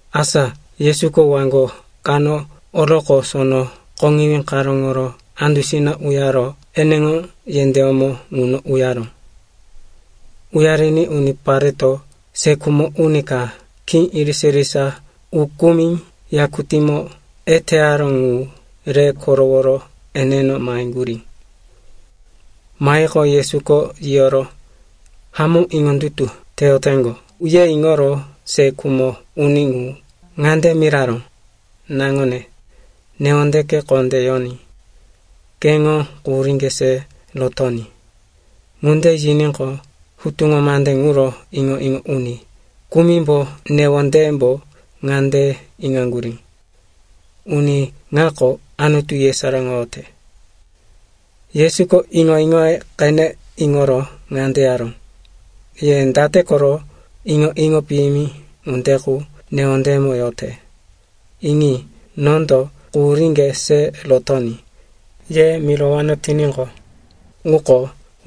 Asa Yesuko waŋgo kano oroqo, sono koŋiwí karóŋo andusina uyaro eneŋo yendéyómo ŋuno uyaró. Uyariní unipareto se khumo uni ka khí irisa-irisa ukumi yakutímo eteyaró ŋu re koroworo eneno maheŋgurí. Mahiqo, Yesuko yiyoro, hamó iŋondutu teyoteŋgo, ye iŋoro se khumo uni ŋu ŋande miraró, “Naŋone, newondeke kondé yoní. Keŋo quhuríŋge se rotoní.” Ŋunde yiníqo, hutuŋo mande ŋuro iŋo-iŋo uni kumimbo newondeyembo ŋande iŋaŋgurí, “Uni ŋako Anutu yesaráŋoyote.” Yesuko iŋo-iŋoye qene iŋoro ŋande yaró, “Ye date koro iŋo-iŋo piyimi ŋunde qu newondeyemo yote? Iŋi, nondo, ‘Quhuríŋge se rotoní,’ ye mirowano tiníqo, ŋuko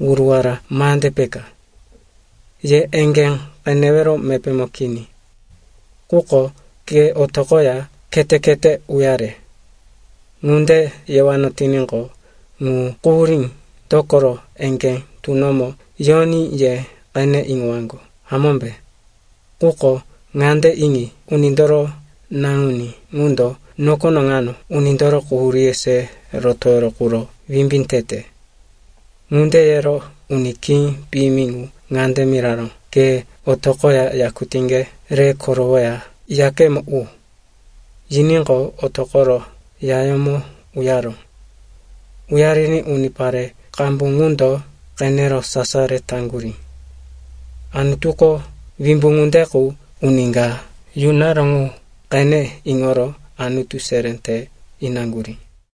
wuruwara mande peka, ye eŋgé qenewero mepémo kini. Quko, ‘Ke otoqoya khete-khete uyare,’ ŋunde yewano tiníqo, ŋu quhurí, dokoro eŋgé tunomo yoní ye qene iŋowaŋgo, hamómbe? Quko ŋande iŋi, Unindoro Naŋuní ŋundo nokono ŋano unindoro quhuríye se rotowero quro wimbí tete.” Ŋunde yero uni khí piyimi ŋu ŋande miraró, “Ke otoqoya yakutíŋge re korowoya, yakemo u.” Yiníqo, otoqoro yayómo uyaró. Uyariní unipare qambu ŋundo qenero sasaro taŋgurí. Anutuko wimbu ŋunde qu uni ka yunaró ŋu qene iŋoro Anutu seré te inaŋgurí.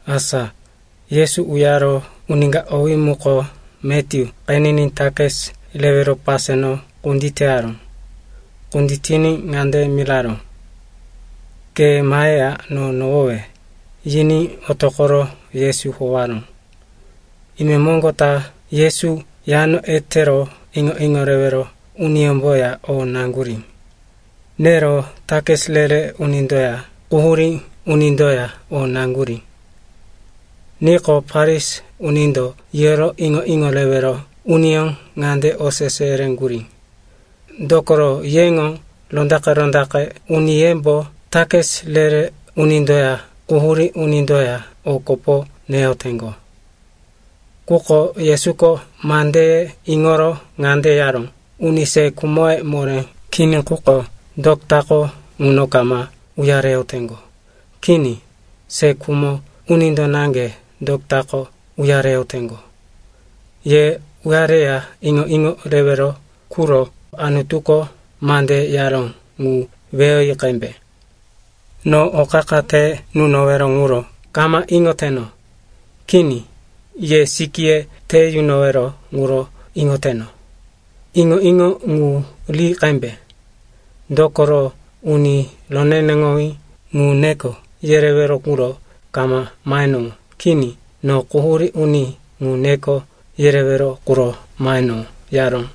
Asa Yesu uyaro, uni ka, owí muko Matyu qeniní takis rewero paseno kunditeyaró. Kunditiní ŋande miraró, “Ke maheya no nohowe.” Yiní otoqoro Yesu howaró. Imemoŋgo ta Yesu yano etero iŋo-iŋo rewero uniyómboya o naŋgurí. Nero takis re-re unindoya quhurí unindoya o naŋgurí. Niqo, Farisi unindo yiyoro iŋo-iŋo rewero uniyó ŋande osese yereŋgurí, “Dokoro yeŋo rondaqe-rondaqe uniyembo takis re-re unindoya quhurí unindoya o kopo neyoteŋgo?” Quko Yesuko mandeye iŋoro ŋande yaró, “Uni se khumoye moré kini quko dotako ŋuno kama uyareyoteŋgo. Kini. Se khumo unindo naŋge dotako uyareyoteŋgo. Ye uyareya iŋo-iŋo rewero quro Anutuko mande yaró ŋu weyoyi qembe, ‘No o qa-qa te nunowero ŋuro kama iŋoteno. Kini, ye sikíye te yunowero ŋuro iŋoteno.’ Iŋo-iŋo ŋu ri qembe, dokoro uni roneneŋowí ŋu neko yerewero quro kama mahenowó. Kini. No quhurí uni ŋu neko yerewero quro mahenowó,” yaró.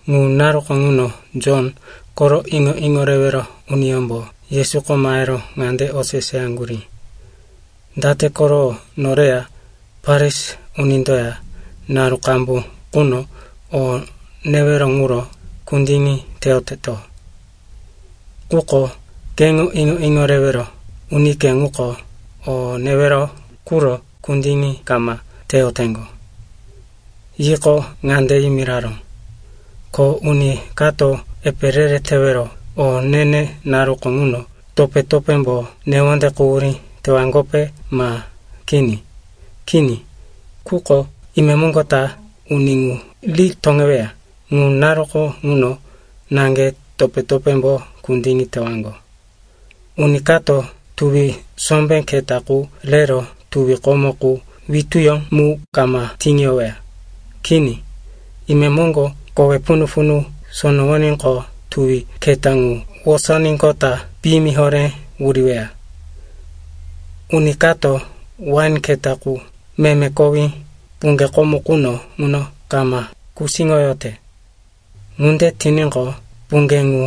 Ŋu naruko ŋuno Jon koro iŋo-iŋo rewero uniyómbo Yesuko mahero ŋande oseseyaŋgurí, “Date koro noreya Farisi unindoya naru qambu quno o newero ŋuro kundiŋi teyoteto, quko keŋo iŋo-iŋo rewero unike ŋuko o newero quro kundiŋi kama teyoteŋgo?” Yiqo, ŋande yimiraró, “Ko uni kato epe re-re tewero o ne-ne naruko ŋuno topé-topémbo newonde quhurí tewaŋgope, ma kini? Kini. Quko imemoŋgo ta uni ŋu ri toŋeweya. Ŋu naruko ŋuno naŋge topé-topémbo kundiŋi tewaŋgo. “Uni kato tuwi sombé keta qu rero tuwi komo qu wituyó mu kama tiŋiyoweya. Kini. Imemoŋgo kowe punu-punu sonowoníqo, tuwi keta ŋu wosoníqota piyimi horé wuriweya. Uni kato wain keta qu meme kowí puŋge komo quno ŋuno kama kusíŋoyote. Ŋunde tiníqo, puŋge ŋu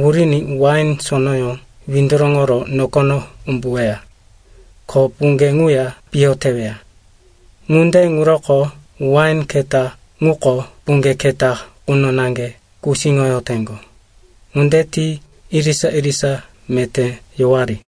wuriní wain sonoyó windoroŋoro nokono umbuweya, ko puŋge ŋuya piyo teweya. Ŋunde ŋuroko wain keta ŋuko puŋge keta quno naŋge kusíŋoyoteŋgo. Ŋunde ti irisa-irisa meté yowari.”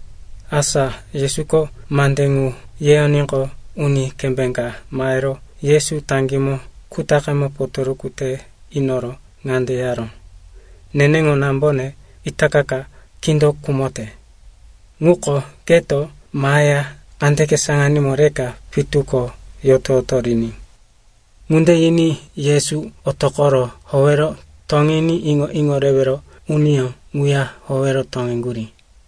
Asa Yesuko mande ŋu yeyoníqo, uni kembé ka mahero Yesu taŋgímo kutaqemo potoruku te inoro ŋande yaró, “Neneŋo nambone itaka ka kindo khumote. Ŋuko keto maheya kandeke saŋanímo reka pitu ko yoto-yoto riní.” Ŋunde yiní Yesu otoqoro howero toŋiní iŋo-iŋo rewero uniyó ŋuya howero toŋeŋgurí.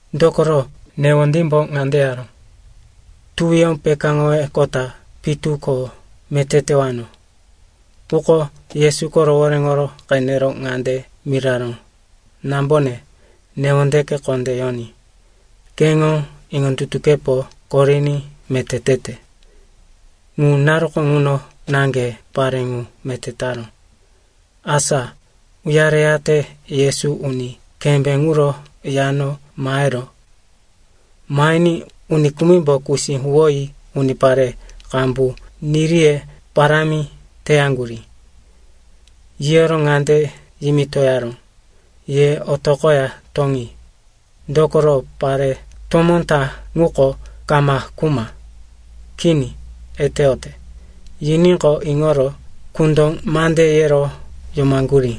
Dokoro newondímbo ŋande yaró, “Tuwiyó pekáŋoroqota pitu ko meté tewano.” Quko Yesuko rohoréŋo qenero ŋande miraró, “Nambone, newondeke kondé yoní. Keŋo iŋondutukepo koriní meté tete.” Ŋu naruko ŋuno naŋge pare ŋu meté taró. Asa uyareyate Yesu uni kembé ŋuro yano maheró. Mahiní uni kumimbo kusí huwoyi unipare qambu niriye parámi teyaŋgurí. Yiyoro ŋande yimitoyaró, “Ye otoqoya toŋi. Dokoro pare tomó ta ŋuko kama khuma. Kini, eteyote.” Yiníqo, iŋoro kundo mande yero yomaŋgurí.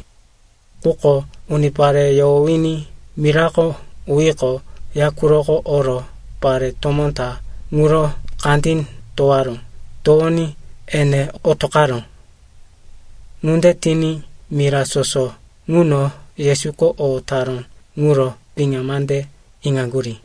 Quko unipare yohowiní mirako uyiqo, ya quroko oro pare tomó ta ŋuro kandí towaró. Towoní ene otoqaró. Ŋunde tiní mira soso ŋuno Yesuko o taró ŋuro piŋa mande iŋaŋgurí.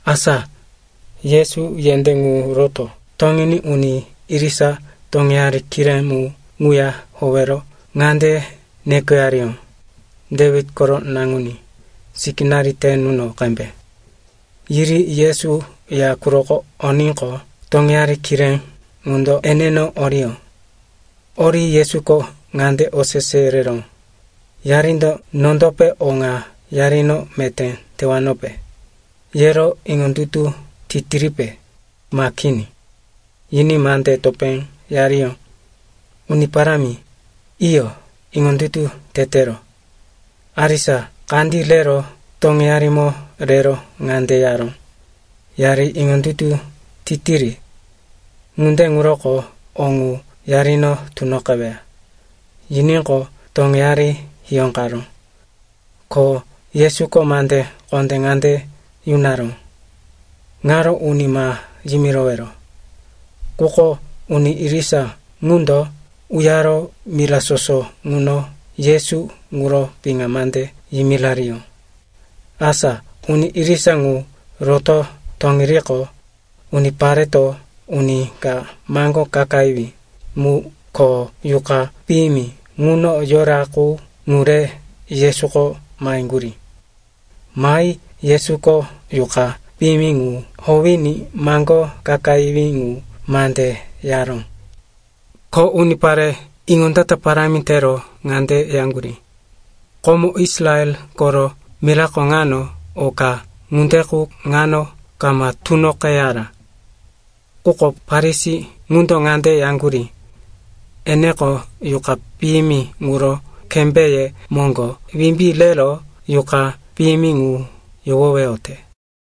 Asa Yesu yendé ŋu roto toŋiní uni irisa toŋeyari kiré mu ŋuya howero ŋande nekoyariyó, “Dewit koro naŋuní, sikínari te nuno qembe.” Yiri Yesu ya quroko oníqo, toŋeyari kiré ŋundo eneno oriyó. Ori Yesuko ŋande osese yereró, “Yarindo nondope o ŋa yarino meté tewanope, yero iŋondutu titiripe, ma kini?” Yiní mande topé yariyó, “Uni Parámi, iyo, iŋondutu tetero.” Arisa kandí rero toŋeyarimo rero ŋande yaró, “Yari iŋondutu titiri, ŋunde ŋuroko o ŋu yarino tunoqeweya.” Yiníqo, toŋeyari hiyóqaró. Ko Yesuko mande kondé ŋande yunaró, “Ŋaro uni ma yimirowero.” Quko uni irisa ŋundo uyaro mira soso ŋuno Yesu ŋuro piŋa mande yimirariyó. Asa uni irisa ŋu roto toŋiriqo, unipareto uni ka maŋgó kakayiwí mu ko yuqa piyimi ŋuno yora qu, ŋu re Yesuko maheŋgurí. Mahi Yesuko yuqa piyimi ŋu howiní maŋgó kakayiwí ŋu mande yaró. Ko unipare iŋondata parámi tero ŋande yaŋgurí, “Komo Israel koro mirako ŋano o ka ŋunde qu ŋano kama tunoqeyara.” Quko Farisi ŋundo ŋande yaŋgurí, “Eneko yuqa piyimi ŋuro kembéye moŋgo wimbí rero yuqa piyimi ŋu yohoweyote.”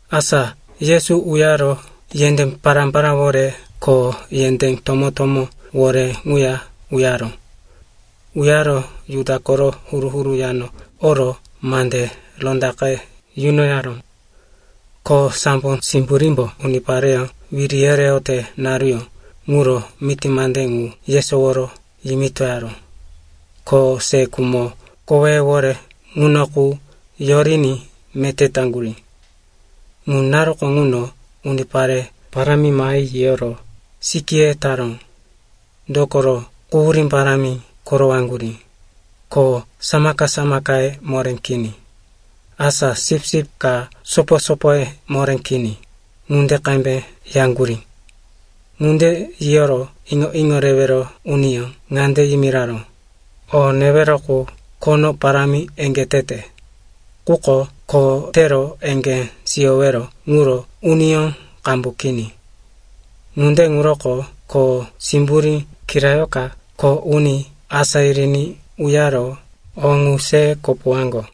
Asa Yesu uyaro yendé pará-paráwore ko yendé tomó-tomówore ŋuya uyaró. Uyaro Juda koro huru-huru yano oro mande rondaqe yunoyaró, ko sambo simburímbo unipareyó wiri yereyote naruyó ŋuro miti mande ŋu yesoworo yimitoyaró, ko se khumo koweyewore ŋuno qu yoriní meté taŋgurí. Ŋu naruko ŋuno unipare parámi mahi yiyoro sikíye taró. Dokoro, quhurí parámi korowaŋgurí, ko samaka-samakaye moré kini, asa sipsip ka sopo-sopoye moré kini ŋunde qembe yaŋgurí. Ŋunde yiyoro iŋo-iŋo rewero uniyó ŋande yimiraró, “O newero qu khono parámi eŋgé tete, quko kho tero eŋgé siyowero ŋuro uniyó qambu kini. Ŋunde ŋuroko kho simburí kirayoka kho uni asá yiriní uyaro o ŋu se kopowaŋgo.”